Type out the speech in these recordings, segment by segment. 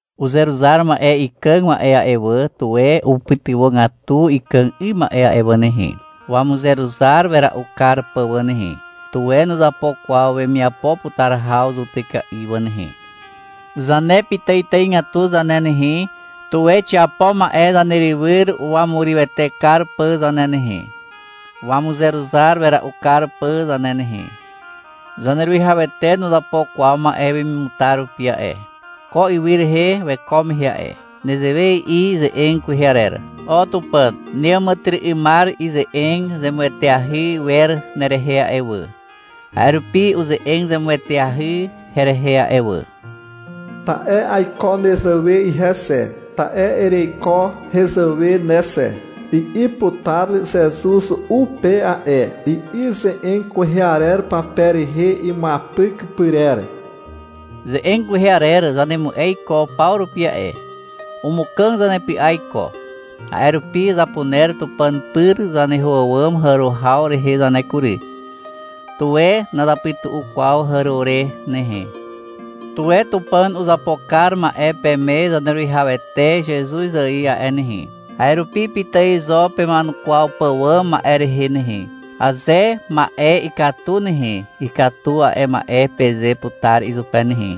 Uzeruzar ma'e ikàg ma'e a'e wà, tuwe upytywàgatu ikàg 'ym ma'e a'e wà nehe, wamuzeruzar wera'u kar pà wà nehe. Tuwe nuzapo kwaw wemiapo putar haw zutyka'i wà nehe. Zane pitàitàigatu zane nehe, tuwe xiapo ma'e zanerywyr wamurywete kar pà zane nehe, wamuzeruzar wera'u kar pà zane nehe. Zaneruwihawete nuzapo kwaw ma'e wemimutar rupi a'e, ko ywy rehe weko mehe a'e. Nezewe i'i ze'eg kwehe arer. — O Tupàn, neàmàtyry'ymar ize'eg zemueteahy wer nerehe a'e wà. A'e rupi uze'eg zemueteahy herehe a'e wà. Ta'e aiko nezàwe ihe xe, ta'e ereiko hezàwe ne xe, i'i putar Zezuz u pe a'e, i'i ze'eg kwehe arer pape rehe imuapyk pyrer. Ze'eg kwehe arer zanemu'e iko paw rupi a'e. Umukàg zanepy'a iko. A'e rupi zapuner Tupàn pyr zaneho àwàm hàro haw rehe zane kury. Tuwe nazapytu'u kwaw hàro re nehe. Tuwe Tupàn uzapo kar ma'e peme Zaneruwihawete Zezuz ài a'e nehe, a'e rupi pitài zo pema'enukwaw pàwàm ma'e rehe nehe. Aze ma'e ikatu nehe, — Ikatu a'e ma'e, peze putar izupe nehe.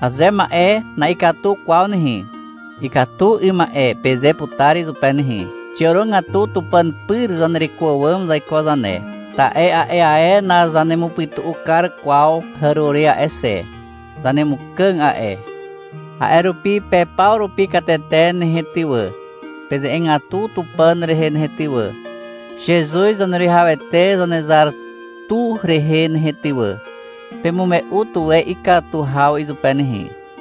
Aze ma'e na'ikatu kwaw nehe, — Ikatu 'ym ma'e, peze putar izupe nehe. Xiàrogatu Tupàn pyr zanereko àwàm zaiko zane, ta'e a'e ae nazanemupytu'u kar kwaw hàro re a'e xe. Zanemukàg a'e. A'e rupi pe paw rupi katete nehe ty wà, peze'egatu Tupàn rehe nehe ty wà, Zezuz Zaneruwihawete Zanezar tu rehe nehe ty wà. Pemume'u tuwe ikatu haw izupe nehe.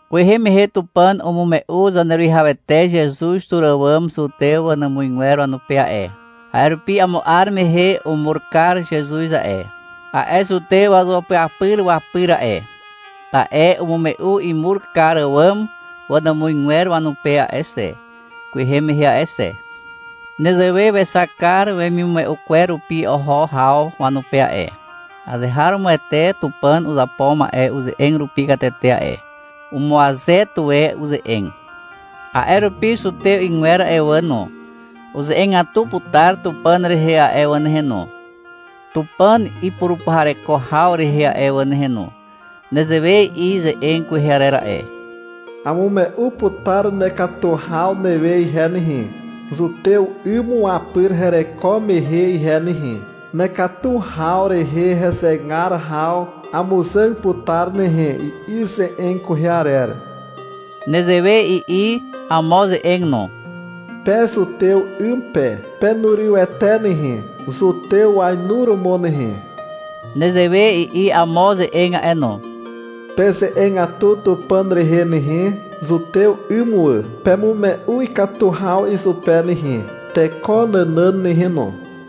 Kwehe mehe Tupàn umume'u Zaneruwihawete Zezuz tur àwàm zutew wanàmuzgwer wanupe a'e. A'e rupi amo 'ar mehe umur kar Zezuz a'e, a'e zutew wazuapyapyr wapyr a'e, ta'e umume'u imur kar àwàm wanàmuzgwer wanupe a'e xe, kwehe mehe a'e xe. Nezewe wexak kar wemimume'u kwer rupi oho haw, wanupe a'e. (Azeharomoete Tupàn uzapo ma'e uze'eg rupi katete a'e. Umuaze tuwe uze'eg.) A'e rupi zutew 'ygwer a'e wà no, uze'egatu putar Tupàn rehe a'e wà nehe no, Tupàn ipurupuhareko haw rehe a'e wà nehe no. Nezewe i'i ze'eg kwehe arer a'e. — Amume'u putar nekatu haw newe ihe nehe, zutew 'ym wapyr hereko mehe ihe nehe. Nekatu haw rehe hezegar haw amuzàg putar nehe, i'i ze'eg kwehe arer. Nezewe i'i amo ze'eg no. — Pe zutew 'ym pe, penurywete nehe, zutew wainuromo nehe. Nezewe i'i amo ze'eg a'e no. — Peze'egatu Tupàn rehe nehe, zutew 'ym wà. Pemume'u ikatu haw izupe nehe, teko nànàn nehe no.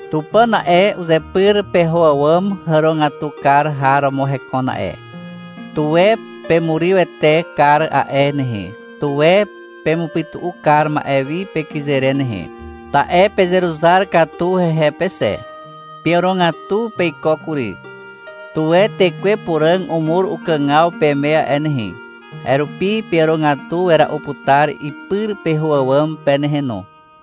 Tupàn a'e, uzepyr peho àwàm hàrogatu kar har romo hekon a'e. Tuwe pemurywete kar a'e nehe, tuwe pemupytu'u kar ma'e wi pekyze re nehe, ta'e pezeruzar katu hehe pe xe. Peàrogatu peiko kury. Tuwe Tekwe Puràg umur ukàgaw peme a'e nehe. A'e rupi peàrogatu wera'u putar ipyr peho àwàm pe nehe no.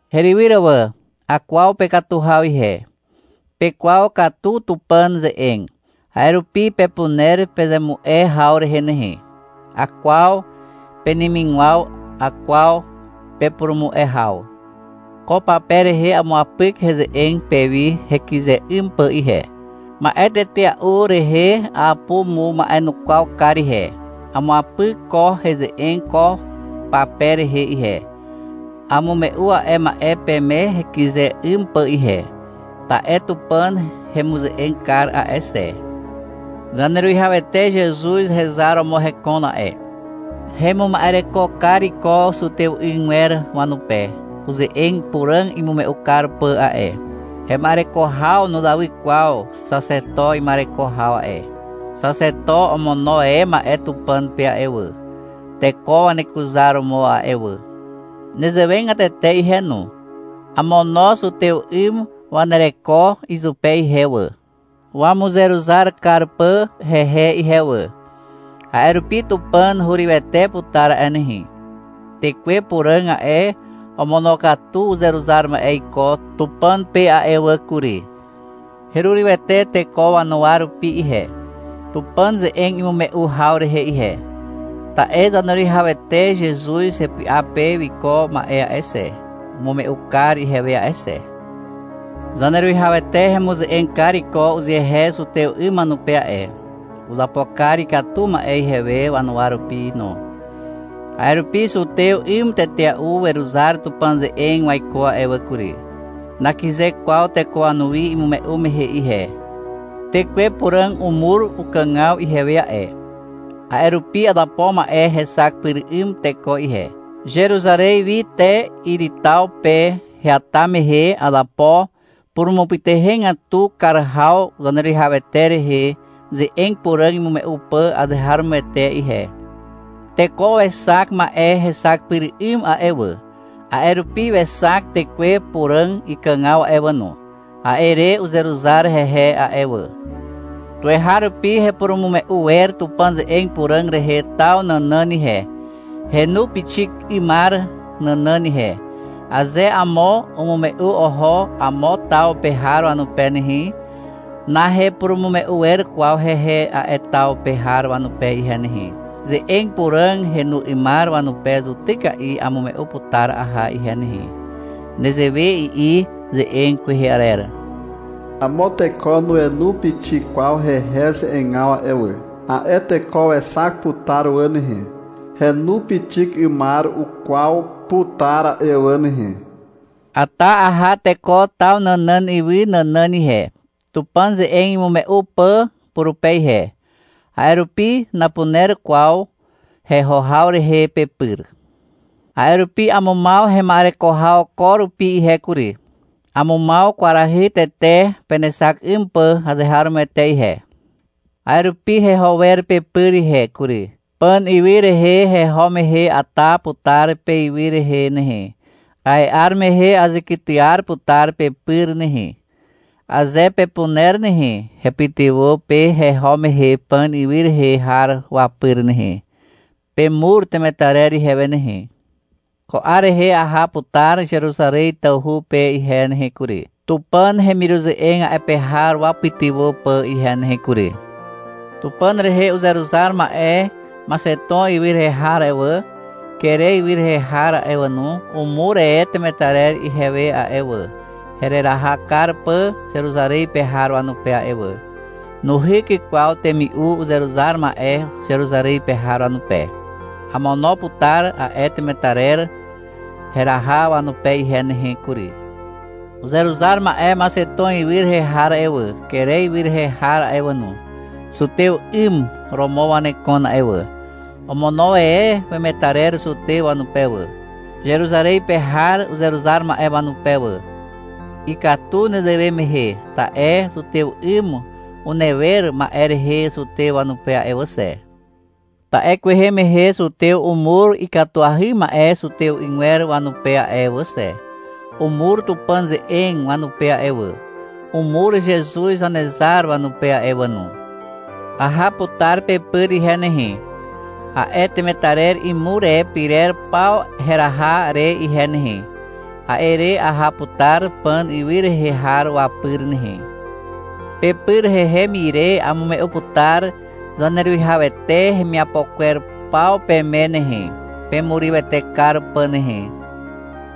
Herywyr wà. Akwaw pekatu haw ihe. Pekwaw katu Tupàn ze'eg, a'e rupi pepuner pezemu'e haw rehe nehe. Akwaw penemigwaw, akwaw pepurumu'e haw. Ko pape rehe amuapyk heze'eg pewi hekyze 'ym pà ihe. Ma'e tetea'u rehe apumuma'enukwaw kar ihe. Amuapyk ko heze'eg ko pape rehe ihe. Amume'u a'e ma'e peme hekyze 'ym pà ihe, ta'e Tupàn hemuze'eg kar a'e xe. Zaneruwihawete Zezuz hezar romo hekon a'e, hemuma'ereko kar iko zutew 'ygwer wanupe uze'eg puràg imume'u kar pà a'e. Hema'ereko haw nuzawy kwaw Xaxeto ima'ereko haw a'e. Xaxeto omono e ma'e Tupàn pe a'e wà, teko wanekuzaromo a'e wà. Nezewegatete ihe no, amono zutew 'ym wanereko izupe ihe wà, wamuzeruzar kar pà hehe ihe wà. A'e rupi Tupàn hurywete putar a'e nehe. Tekwe Puràg a'e, omonokatu uzeruzar ma'e iko Tupàn pe a'e wà kury. Herurywete teko wanuwa rupi ihe, Tupàn ze'eg imume'u haw rehe ihe. Ta'e Zaneruwihawete Zezuz hepy'a pe wiko ma'e a'e xe, umume'u kar ihewe a'e xe. Zaneruwihawete hemuze'eg kar iko uzehe zutew 'ym wanupe a'e. Uzapo kar ikatu ma'e ihewe wanuwa rupi no. A'e rupi zutew 'ym tetea'u weruzar Tupàn ze'eg waiko a'e wà kury. Nakyze kwaw teko wanuwi imume'u mehe ihe. Tekwe Puràg umur ukàgaw ihewe a'e. A'e rupi azapo ma'e hexak pyr 'ym teko ihe. Zeruzarez wi te Iri taw pe heata mehe, azapo purumupytuhegatu kar haw Zaneruwihawete rehe ze'eg puràg imume'u pà azeharomoete ihe. Teko wexak ma'e hexak pyr 'ym a'e wà. A'e rupi wexak Tekwe Puràg ikàgaw a'e wà no. A'e re uzeruzar hehe a'e wà. Tuweharupi hepurumume'u wer Tupàn ze'eg puràg rehe taw nànàn ihe, henu pixik 'ymar nànàn ihe. Aze amo umume'u oho amo taw pe har wanupe nehe, nahepurumume'u wer kwaw hehe a'e taw pe har wanupe ihe nehe. Ze'eg puràg henu 'ymar wanupe zutyka'i amume'u putar aha ihe nehe. Nezewe i'i ze'eg kwehe arer. — Amo teko nuenu pixik kwaw hehe ze'egaw a'e wà. A'e teko wexak putar wà nehe. Henu pixik 'ymar ukwaw putar a'e wà nehe. Ata aha teko taw nànàn ywy nànàn ihe, Tupàn ze'eg imume'u pà purupe ihe. A'e rupi napuner kwaw heho haw rehe pepyr. A'e rupi amumaw hema'ereko haw ko rupi ihe kury. Amumaw kwarahy tete penexak 'ym pà azeharomoete ihe. A'e rupi heho wer pepyr ihe kury. Pàn ywy rehe heho mehe ata putar peywy rehe nehe. A'e 'ar mehe azekytyar putar pepyr nehe. Aze pepuner nehe, hepytywà pe heho mehe Pàn ywy rehe har wapyr nehe. Pemur temetarer ihewe nehe. Ko 'ar rehe aha putar Zeruzarez tawhu pe ihe nehe kury, Tupàn hemiruze'eg a'e pe har wapytywà pà ihe nehe kury. Tupàn rehe uzeruzar ma'e Maxeton ywy rehe har a'e wà, Kere ywy rehe har a'e wà no, umur e temetarer ihewe a'e wà, hereraha kar pà Zeruzarez pe har wanupe a'e wà. Nuhyk kwaw temi'u uzeruzar ma'e Zeruzarez pe har wanupe. Amono putar a'e temetarer heraha wanupe ihe nehe kury. Uzeruzar ma'e Maxeton ywy rehe har a'e wà, Kere ywy rehe har a'e wà no, zutew 'ym romo wanekon a'e wà. Omono e wemetarer zutew wanupe wà, Zeruzarez pe har uzeruzar ma'e wanupe wà. Ikatu nezewe mehe, ta'e zutew 'ym unewer ma'e rehe zutew wanupe a'e wà xe. Ta'e kwehe mehe zutew umur ikatuahy ma'e zutew 'ygwer wanupe a'e wà xe, (Umur Tupàn ze'eg wanupe a'e wà. Umur Zezuz Zanezar wanupe a'e wà no.) Aha putar pepyr ihe nehe, a'e temetarer imur e pyrer paw heraha re ihe nehe. A'e re aha putar Pàn ywy rehe har wapyr nehe. Pepyr hehem ire amume'u putar Zaneruwihawete hemiapo kwer paw peme nehe, pemurywete kar pà nehe.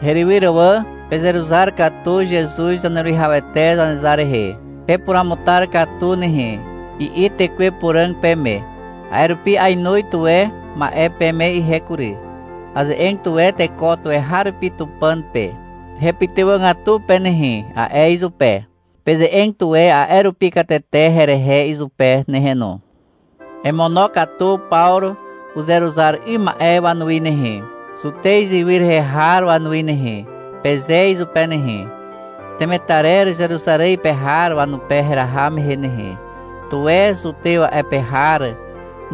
Herywyr wà. Pezeruzar katu Zezuz Zaneruwihawete Zanezar rehe. — Pepuruamutar katu nehe, i'i Tekwe Puràg peme. A'e rupi ainoz tuwe ma'e peme ihe kury. Aze'eg tuwe teko tuweharupi Tupàn pe. — Hepytywàgatu pe nehe, a'e izupe. Peze'eg tuwe a'e rupi katete herehe izupe nehe no. — Emonokatu Pawru uzeruzar 'ym ma'e wanuwi nehe, Zutez ywy rehe har wanuwi nehe, peze izupe nehe. — Temetarer Zeruzarez pe har wanupe heraha mehe nehe, tuwe zutew a'e pe har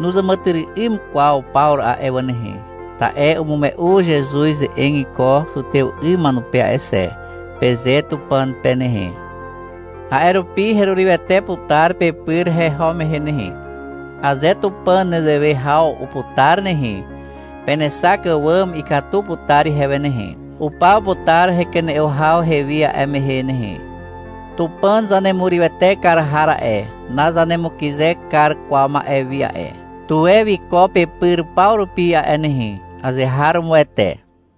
nuzàmàtyry'ym kwaw Pawru a'e wà nehe, ta'e umume'u Zezuz ze'eg iko zutew 'ym wanupe a'e xe, peze Tupàn pe nehe. A'e rupi herurywete putar pepyr heho mehe nehe, aze Tupàn nezewe haw uputar nehe. Penexak àwàm ikatu putar ihewe nehe. Upaw putar hekene'o haw hewi a'e mehe nehe. Tupàn zanemurywete kar har a'e, nazanemukyze kar kwaw ma'e wi a'e. Tuwe wiko pepyr paw rupi a'e nehe. Azeharomoete.